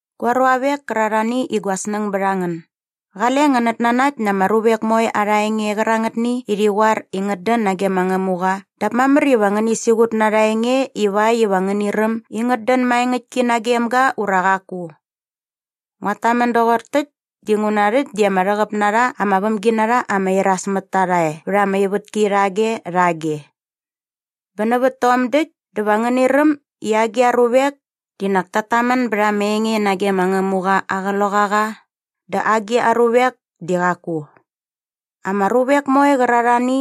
Gua ruavek kärarhani i gua snäng bät a ngän, qale ngänät nanakt na ama ruvek moe arha enge qärangätni i rhi qoar i ngät dän nage ma Ngämuqa dap mamär iva ngäni siqut na arha enge ivakt iva ngäni räm i ngät dän maengäktki nagem ga ura qaku. Nguat tamän doqor täkt dinguna rhäkt di ama rhäqäp na rha ama vämginarha ama iras mät ta rha e vät ama ivätki rhage rhage. Bä nävät tom däkt dä va ngäni räm i agi a ruvek di nak ta tamän bät ama enge nage ma Ngämuqa aa Qloqaqa dä agi a ruvek di qaku. Ama ruvek moe qärarhani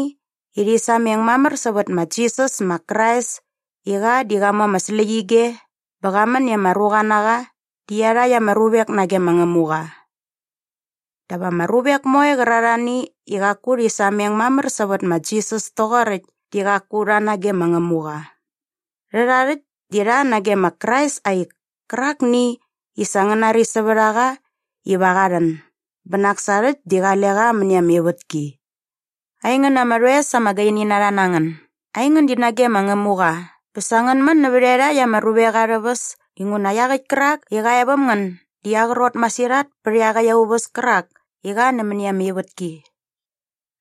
i rhi sameng mamär sävät ma Jisas ma Krais i qa di qa mu ama släqyige bä qa män i ama ruqa na qa di iarhakt ama ruvek nage ma Ngämuqa. Dap ama ruvek moe qärarhani i qaku rhi sameng mamär sävät ma Jisas toqoräkt di qaku rha nage ma Ngämuqa. Rhärha rhäkt di rha nage ma Krais aa ik kärakni i sa ngän nari sävät a qa iva qa rhän bä nak sa rhäkt di qale qa mäni ama ivätki. Aingän ama rhoes ama gaini na rha na ngän, aingän di nage ma Ngämuqa bä sa ngän män nävä iarhakt ama ruvek arhä väs inguna iaqäkt kärak i qa e väm ngän di aa qrot masirhat pä iaqäkt aa uväs kärak i qa nämäni ama ivätki.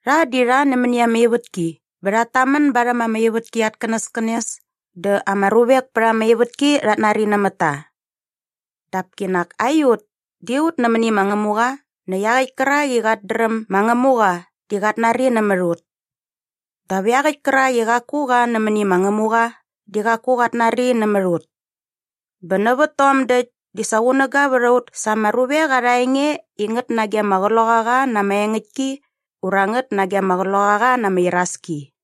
Rha di rha nämäni ama ivätki bä rhat tamän barhäm ama ivätki at känäskänes dä ama ruvek pät ama ivätki rhat nari nämät ta. Dap kinak aiut di ut nämäni ma Ngämuqa näkt iaqäkt kärak i qat dräm ma Ngämuqa di qat nari nämät ut. Dap iaqäkt kärak i qaku qa nämäni ma Ngämuqa di qaku qat nari nämät ut. Bä nävät tom däkt di sa qunäga vät a ut sa ama ruvek arha enge i ngät nage ama Qloqaqa na ama engäktki ura ngät nage ama qloqaqa na ama iraski.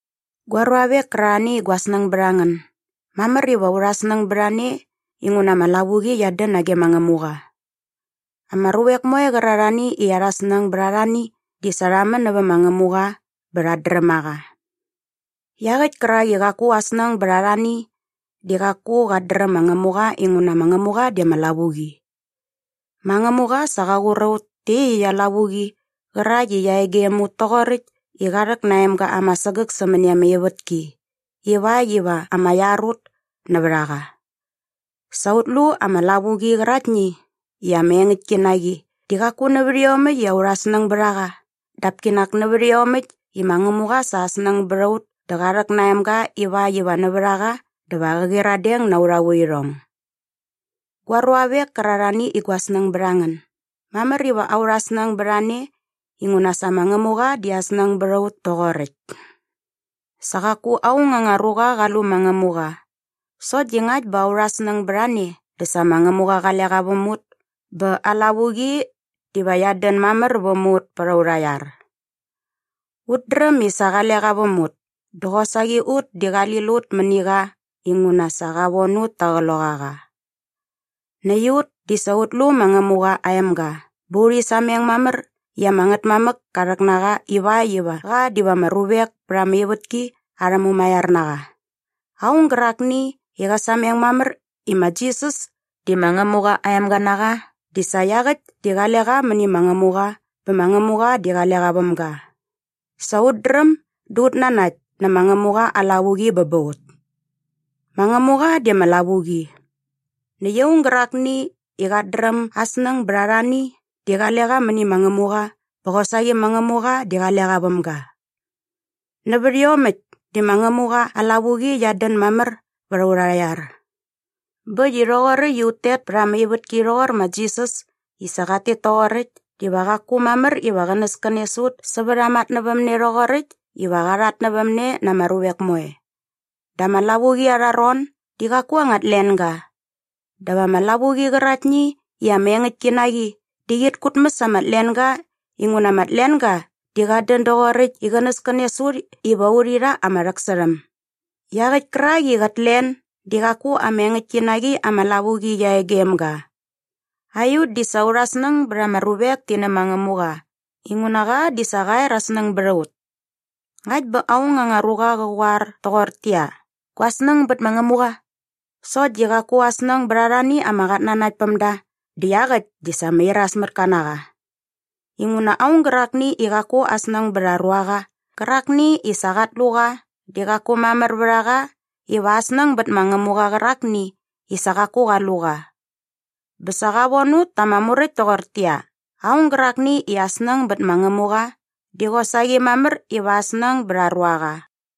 Gua ruavek kärarhani i gua snäng bät a ngän, mamär iva aurha snäng bät a ne inguna ama lavuqi qiat dän nage ma Ngämuqa. Ama ruvek moe qärarhani i arha snäng bät arhani di sa rha män nävä ma Ngämuqa bä rhat dräm a qa. Iaqäkt kärak i qaku aa snäng bät arhani di qaku qat dräm ma Ngämuqa inguna ma Ngämuqa di ama lavuqi. Ma Ngämuqa sa qa qur a ut tä iaqyäkt aa lavuqi qärakt i qia e gem ut toqoräkt i qa rhäk na aa emga ama sägäk sämäni ama ivätki ivakt iva ama iar ut nävät a qa. Sa ut lu ama lavuqi qäraktni i ama engäktki na qi di qaku nävät iomäkt i aurha snäng bät a qa dap kinak nävät iomäkt i ma Ngämuqa sa aa snäng bät a ut dä qa rhäk na aa emga ivakt iva nävät a qa dä va qä qyiradeng na aurha vuirhong. Gua ruavek kärarhani i gua snäng bät a ngän, mamär iva aurha snäng bät a ne inguna sa ma Ngämuqa di aa snäng bät a ut toqoräkt. Sa qaku aung anga ruqa qa lu ma Ngämuqa sokt di ngakt bä aurha snäng bät a ne dä sa ma Ngämuqa qale qa väm ut bä aa lavuqi diva qiat dän mamär väm ut pät aurha iar. Ut dräm i sa qale qa väm ut dä qosaqi ut di qali lut mäni qa inguna sa qa von ut ta aa Qloqaqa. Näkt ut di sa ut lu ma Ngämuqa aa emga bä urhi sameng mamär i ama Ngätmamäk ka rhäk na qa ivakt iva qa diva ama ruvek pät ama ivätki arhä Mumaiar na qa. Aung gärakni i qä sameng mamär i ma Jisas di ma Ngämuqa aa emga na qa di sa iaqäkt di qale qa mäni ma Ngämuqa bä ma Ngämuqa di qale qa väm ga. Sa ut dräm dä ut nanakt nä ma Ngämuqa aa lavuqi bä ba ut. Ma Ngämuqa di ama lavuqi. Näkt aung gärakni i qat dräm aa snäng bät arhani di qale qa mäni ma Ngämuqa bä qosaqi ma Ngämuqa di qale qa väm ga. Nävät iomäkt di ma Ngämuqa aa lavuqi qiat dän mamär vät aurha iar. Bä äkt i rhoqoräkt i ut tet pät ama ivätki rhoqor ma Jisas i sa qat tet toqoräkt diva qaku mamär iva qänäskänes ut sävät aa matnävämne rhoqoräkt iva qa rhatnävämne na ama ruvek moe. Da ama lavuqi arha ron di qaku anga tlenga. Dap ama lavuqi qäraktni i ama engäktki na qi di qit kutmäs ama tlenga inguna ama tlenga di qat dän doqoräkt i qänäskänes ut iva urhi rha ama rhäksärhäm. Iaqäkt kärak i qät len di qaku ama engäktki na qi ama lavuqi qia e gem ga. Aiut di sa aurha snäng bät ama ruvek ti nä ma Ngämuqa inguna qa di sa qa er aa snäng bät a ut. Ngakt bä aung anga ruqa qä qoar toqortäqyia, “Gua snäng bät ma Ngämuqa” sokt di qaku aa snäng bät arhani ama qatnanaktpämda dä iaqäkt di sa ama irasmätka na qa. Inguna aung gärakni i qaku aa snäng bät aa ruaqa qärakni i sa qat lu qa di qaku mamär vät a qa iva aa snäng bät ma Ngämuqa qärakni i sa qaku qa lu qa. Bä sa qa von ut ta ama muräkt toqortäqyia, aung gärakni i aa snäng bät ma Ngämuqa di qosaqi mamär iva aa snäng bät aa ruaqa.